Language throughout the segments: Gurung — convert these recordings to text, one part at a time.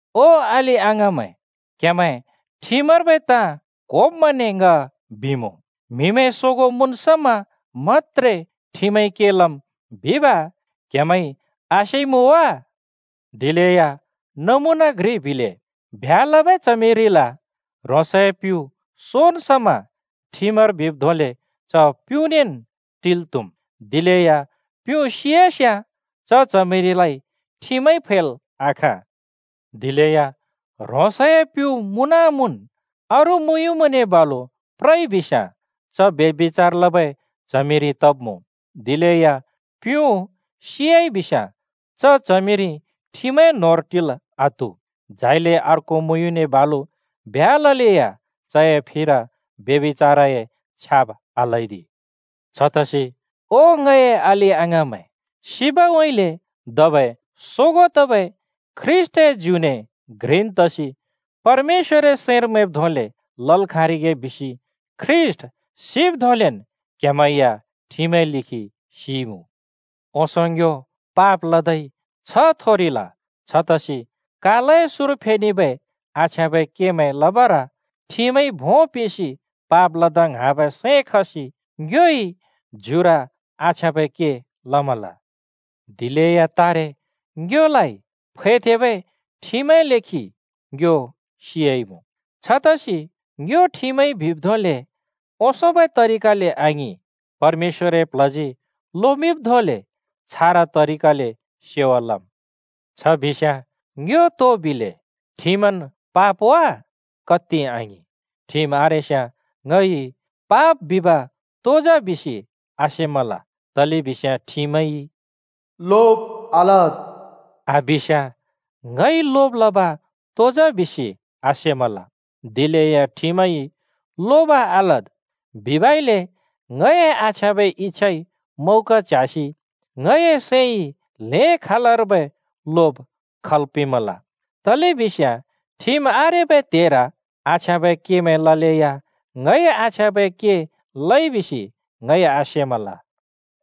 ओ अलि-अङाँमैं, क्हेमैं ठिमर्बै ताँ क्होब्मैंने ङ बिमुँ: म्हिमैं सोगों मुँन् समा मत्‍त्रे ठिमइ के लम् बिब क्‍हेमैंइ आसेइमुँ वा? नमुना घ्रि बिले, ब्ह्‍या लबै च्हमिरिल ह्रोंसए प्युँ सोन् समा ठिमर बिब् धोंले च प्युँनेन् टिल् त्हुम्। दिलेया प्युँ सियास्‍याँ च च्हमिरिलाइ ठिमइ फैल् आखाँ। दिलेया ह्रोंसए प्युँ मुँन-मुँन् अरू मुँयुँने बालु प्रइबिस्‍याँ च ब्यभिचार लबै च्हमिरि तब्‍मुँ। दिलेया प्युँ सियाइबिस्‍याँ च च्हमिरि ठिमए न्होंर टिल् आत्हु। झाइले अर्को मुँयुँने बालु ब्ह्‍या ललेया चए फिर ब्यभिचारए छ्याब् आल्‍हैदि। छतसि ओ ङए अलि-अङाँमैं, सिबउँइँले धबै सोगों तबै ख्रीष्‍टए ज्युने घ्रिन् तसि परमेश्‍वरए सैंर मैंब् धोंले लल् खाँरिगे बिसि ख्रीष्‍ट सिब् धोंलेन् क्हेमैं या ठिमए लेखि सिइमुँ। ओंसों ङ्यो पाप लदै छ्ह थोरिल, छतसि कालए सुँर फेनेबै आछ्याँबै केमैं लबर ठिमइ भों पिंसि पाप लदा ङ्हाँबै सैं खसि ङ्योइ ज्युर आछ्याँबै के लमल। दिलेया तारे ङ्योलाइ फैथेंबै ठिमए लेखि ङ्यो सियाइमुँ। छतसि ङ्यो ठिमइ बिब् धोंले ओंसोंबै तरिकाले आङिं, परमेश्‍वरए प्ल्हजी लोमिंब् धोंले छारा तरिकाले सेवा लम्। छ बिस्‍याँ ङ्यो तो बिले? ठिमन् पाप वा? कत्ति आङिं! ठिम आरेस्याँ ङइ पाप बिब तो जा बिसि आसेमल, तलेबिस्याँ ठिमइ “लोब आलद्” आबिस्‍याँ ङइ लोब लब तो जा बिसि आसेमल, दिलेया ठिमइ “लोब आलद्” बिबइले ङए आछ्याँबै इच्‍छाइ मौका च्ह्‍यासि ङए सैंइ ल्हें खालर्बै लोब खल् पिंमल, तलेबिस्याँ ठिम आरेबै त्हेर आछ्याँबै केमैं ललेया ङइ आछ्याँबै के लइ बिसि ङइ आसेमल।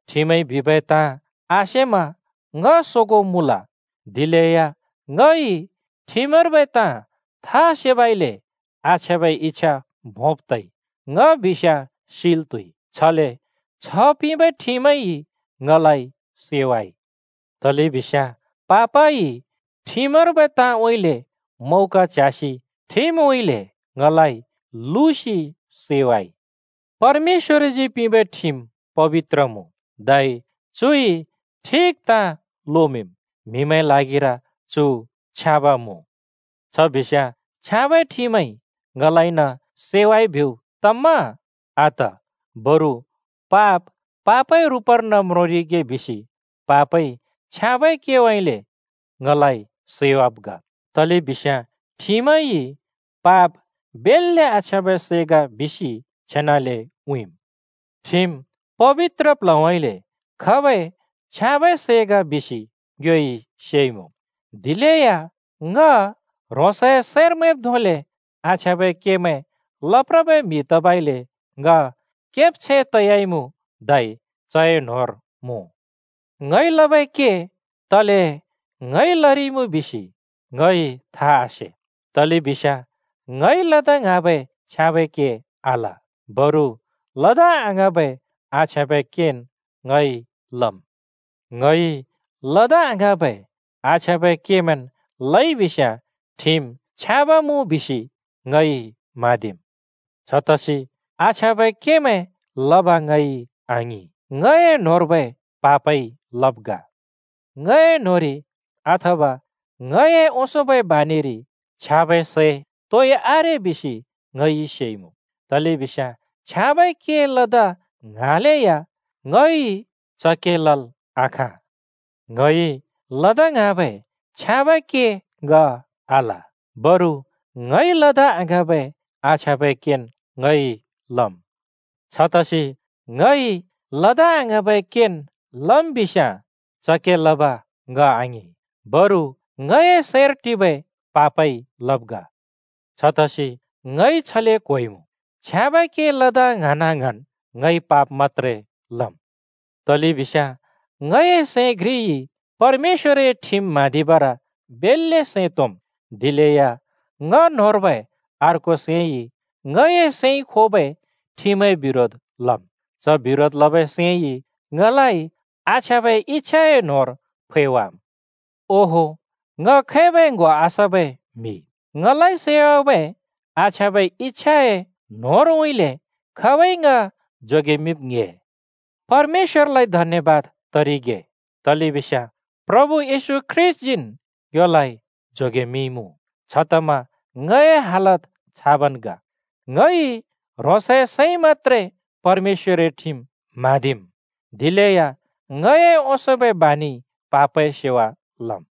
ठिमइ बिबै ताँ आसेमा ङ सोगों मुँल, दिलेया ङइ ठमर्बै ताँ था सेबइले आछ्याँबै इच्छा भोंब तइ, ङ बिस्याँ सिल् त्हुइ। छले छ्ह पिंबै ठिमइ ङलाइ सैवाइ। तलेबिस्याँ पापइ ठिमर्बै ताँउँइँले मौका च्ह्‍यासि ठिमउँइँले ङलाइ लुसि सैवाइ। परमेश्‍वरजी पिंबै ठिम पबित्र मुँ, धै चुइ ठिक ताँ लोमिंम्, म्‍हिमैंए ल्हागिर चु छ्याँब मुँ। छ बिस्याँ छ्याँबै ठिमइ ङलाइन सैवाइ बिब् तम्‍मा? आत! बरु पाप पापए रुपर्न म्रोंरिगे बिसि पापइ छ्याँबै केउँइँले ङलाइ सैवाब् ग। तलेबिस्याँ ठिमइ पाप बेल्‍ले आछ्याँबै सै ग बिसि छेनाले उँइँम्। ठिम पबित्र प्ल्हउँइँले खबै छ्याँबै सै ग बिसि ङ्योइ सेइमुँ, दिलेया ङ ह्रोंसए सैंर मैंब् धोंले आछ्याँबै केमैं लप्रबै म्हि तबइले ङ केब्छैं तयाइमुँ धै चए न्होंर मुँ। ङइ लबै के तले ङइ लरिइमुँ बिसि ङइ था आसे, तलेबिस्याँ ङइ लदा ङ्हाँबै छ्याँबै के आल, बरु लदा आङ्हाँबै आछ्याँबै केन् ङइ लम्। ङइ लदा आङ्हाँबै आछ्याँबै केमैंन् लइ बिस्याँ ठिम छ्याँब मुँ बिसि ङइ म्हाँदिम्। छतसि आछ्याँबै केमैं लब ङइ आङिं, ङए न्‍होंर्बै पापइ लब् ग। ङए न्होंरि, अथवा ङए ओंसोंबै बानिरि, छ्याँबै सै तोइ आरे बिसि ङइ सेइमुँ। तलेबिस्याँ छ्याँबै के लदा ङ्हाँलेया ङइ च के लल् आखाँ। ङइ लदा ङ्हाँबै छ्याँबै के ङ आल, बरु ङइ लदा आङ्हाँबै आछ्याँबै केन् ङइ लम्। छतसि ङइ लदा आङ्हाँबै केन् लम् बिस्‍याँ च के लब ङ आङिं, बरु ङए सैंर टिबै पापइ लब् ग। छतसि ङइ छले क्होइमुँ: छ्याँबै के लदा ङ्हाँना-ङ्हाँन् ङइ पाप मत्‍त्रे लम्, तलेबिस्याँ ङए सैं घ्रिइ परमेश्‍वरए ठिम म्हाँदिबर बेल्‍ले सैं तोंम्, दिलेया ङ न्होंर्बै अर्को सैंइ ङए सैंइ खोबै ठिमए बिरोध लम्। च बिरोध लबै सैंइ ङलाइ आछ्याँबै इच्‍छाए न्होंर फैवाम्। ओहो, ङ खैबै ङ्‍हो आसबै म्‍हि! ङलाइ सैवाबै आछ्याँबै इच्‍छाए न्होंरउँइँले खाबइ ङ जोगेमिंब् ङ्‍हे? परमेश्‍वरलाइ धन्‍यबाद तरिगे, तलेबिस्याँ प्रभु येशू ख्रीष्‍टजीन् ङ्योलाइ जोगेमिंइमुँ! छतमा ङए हालत छाबन् ग। ङइ ह्रोंसए सैंइ मत्‍त्रे परमेश्‍वरए ठिम म्हाँदिम्, दिलेया ङए ओंसोंबै बानिइ पापए सेवा लम्।